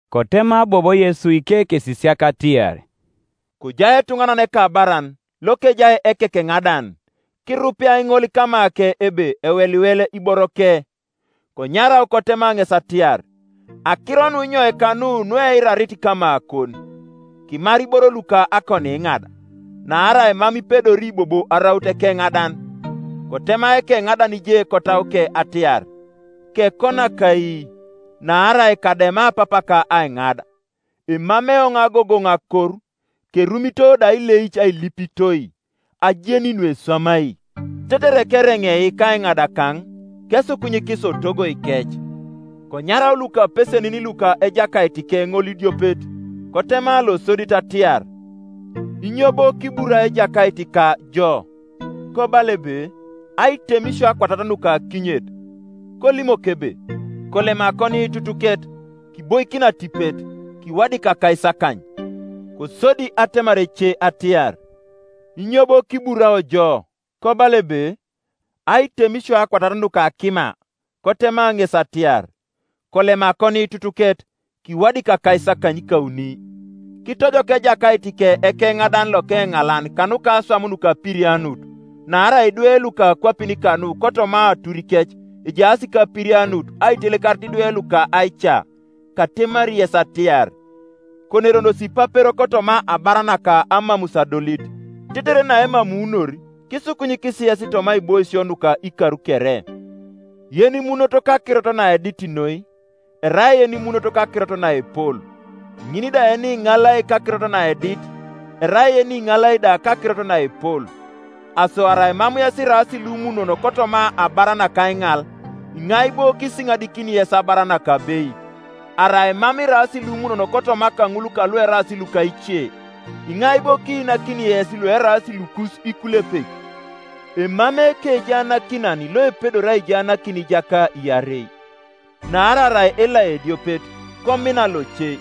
Kotema bobo Yesu ikekesisiak atiar, “Kojai etuŋanan ekabaran lokejai ekekeŋadan, kirupeai ŋol kamake ebe eweliwel iboroke. Konyarau kotema ŋes atiar, ‘Akiro nunyoika nu nueirarit kamakon? Kimar iboro luka akoniiŋad, naarai mam ipedori bobo araut ekeŋadan.’ Kotema ekeŋadan je kotauke atiar, ‘Kekonak ai, naarai kadema papaka aiŋad? Emamei eoŋ agogoŋ akor, kerumito da ileic ailipitoi. Ajeni nueswamai, tetere keereŋei kaiŋadakaŋ, kesukunyikis otogoikec.’ Konyarau lukapesenin luka ejakaitike ŋolidiopet, kotema losodit atiar, ‘Inyo bo kiburai ejakaitika jo?’ Kobala ebe, ‘Aitemisio akwatat nuka akinyet.’ Kolimok ebe, ‘Kolem akoniitutuket, kiboikin atipet, kiwadik akaisakany.’ Kosodi atemar ece atiar, ‘Inyo bo kiburao jo?’ Kobala ebe, ‘Aitemisio akwatat nuka akima.’ Kotema ŋes atiar, ‘Kolem akoniitutuket, kiwadik akaisakanykauni.’ Kitojok ejakaitike ekeŋadan lokeŋalan kanuka aswam nukapirianut; naarai idwe luka akwapin kanu kotoma aturikec ejaas kapirianut aitelekarit idwe luka aica. Katemari yes atiar, Koneronosi ipapero kotoma abar naka amamus adolit, tetere naemamuunor, kisukunyikis yes toma aiboisio nuka ikar kere. “Yenimunot kakirot naedit noi, erai yenimunot kakirot naepol; ŋin da yeniŋalai kakirot naedit, erai yeniŋalai da kakirot naepol. Aso arai mam yes iraas lumunon kotoma abar naka aiŋal, iŋai bo kisiŋadikini yes abar nakabeit? Arai mam iraas lumunon kotoma kaŋul kalueraas luka ice, iŋai bo kiinakini yes lueraas lukus ikulepek? Emamei ekejaanakinan loepedori aijaanakin ijaka iarei, naarai arai elai ediopet, komina loce,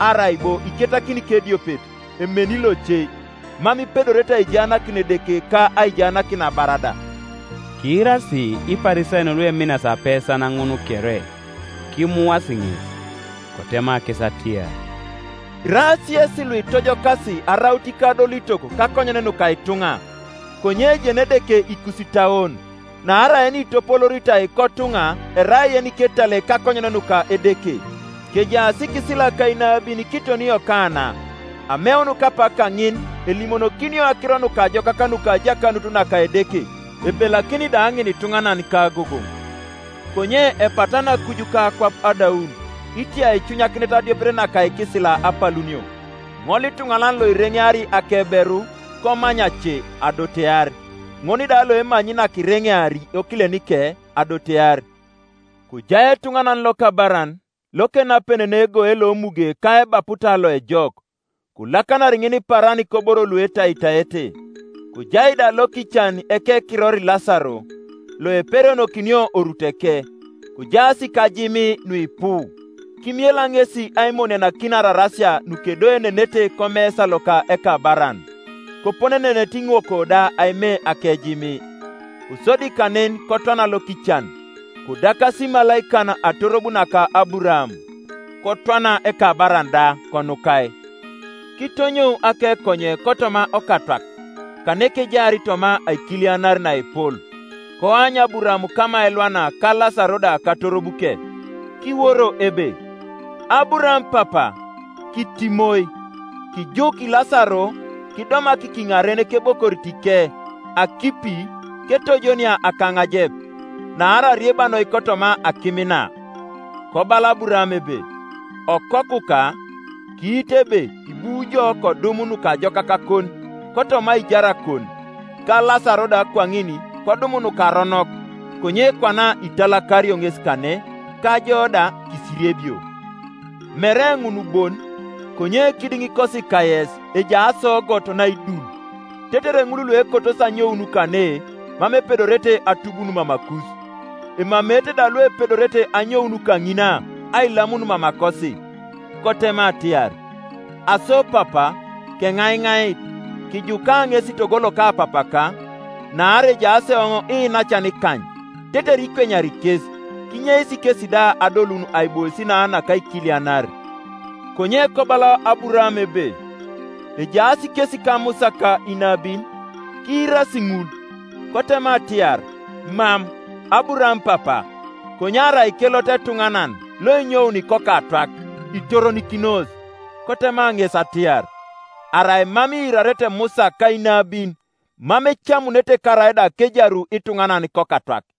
arai bo iketakin kediopet emeni loce. Mam ipedorete aijaanakin Edeke ka aijaanakin abar da.” Kiirasi Iparisayon lueminas apesan ŋun kere, kimuasi ŋes. Kotema kes atiar, “Iraas yesi luitojokas araut ikadolitok kakonyen nuka ituŋa, konye ejeni Edeke ikusitauon; naarai yenitopolooritai kotuŋa erai yeniketal kakonyen nuka Edeke. “Kejaas ikisila ka inabin kiton Yokana; ameun kapak kaŋin elimonokinio akiro nukajokak nuka ajakanut naka Edeke, ebelakini da ŋinituŋanan kagogoŋ. Konye epatana akuj ka akwap adaun itia aicunyakinet adiopet naka ikisila apalunio. “Ŋolituŋanan loereŋeari akeberu komany ace adotear, ŋol da loemanyi nakireŋeari okilenike adotear. “Kojai etuŋanan lokabaran, lokenapenenei egoe lomuge ka ebaputa loejok, kolakanar ŋinipaaran koboro luetaitaete. Kojai da lokican ekekiror Lasaro, loeperionokino oruteke, kojaas kajimii nuipu. Kimiela ŋesi aimonianakin ararasia nukedoenenete komesa loka ekabaran; koponenenete iŋokwo da aime akejimii. Kosodi kanen kotwana lokican, kodakasi imalaikan atorob naka Aburaam. Kotwana ekabaran da, konukai. Kitonyou akekonye kotoma Okatwak, kanekejaar toma aikilianar naepol, koany Aburaam kama elwana ka Lasaro da katorobuke. Kiworo ebe, ‘Aburaam Papa, kitimoi, kijuk Lasaro kidomak kiŋaren kebokoritike akipi ketojonia akaŋajep; naarai arieba noi kotoma akim na.’ Kobala Aburaam ebe, ‘Okokuka, kiitu ebe ibu ijo kodum nukajokakakon kotoma aijarakon, ka Lasaro da kwaŋin kodum nukaronok; konye kwana italakario ŋes kane, ka jo da kisiriebio. Mere ŋun bon, konye kidiŋikosi kayes ejai asoogot naidul, tetere ŋulluekotosi anyoun kane mam epedorete atubun mamakus, emameete da luepedorete anyoun kaŋina ailamun mamakosi.’ Kotema atiar, ‘Aso papa, keŋaiŋait, kijuka ŋes togo loka papaka, naarai ejaas eoŋ iinacan ikany, tetere ikwenyari kes, kinyeis kesi da adolun aibois na nakaikilianar.’ Konye kobala Aburaam ebe, ‘Ejaas kes kaMusa ka inabin, kiirasi ŋul.’ Kotema atiar, ‘Mam, Aburaam Papa; konye arai kelot etuŋanan loenyouni kokatwak, itoronikinos.’ Kotema ŋes atiar, ‘Arai mam iirarete Musa ka inabin, mam ecamunete karaida kejaru ituŋanan kokatwak.’”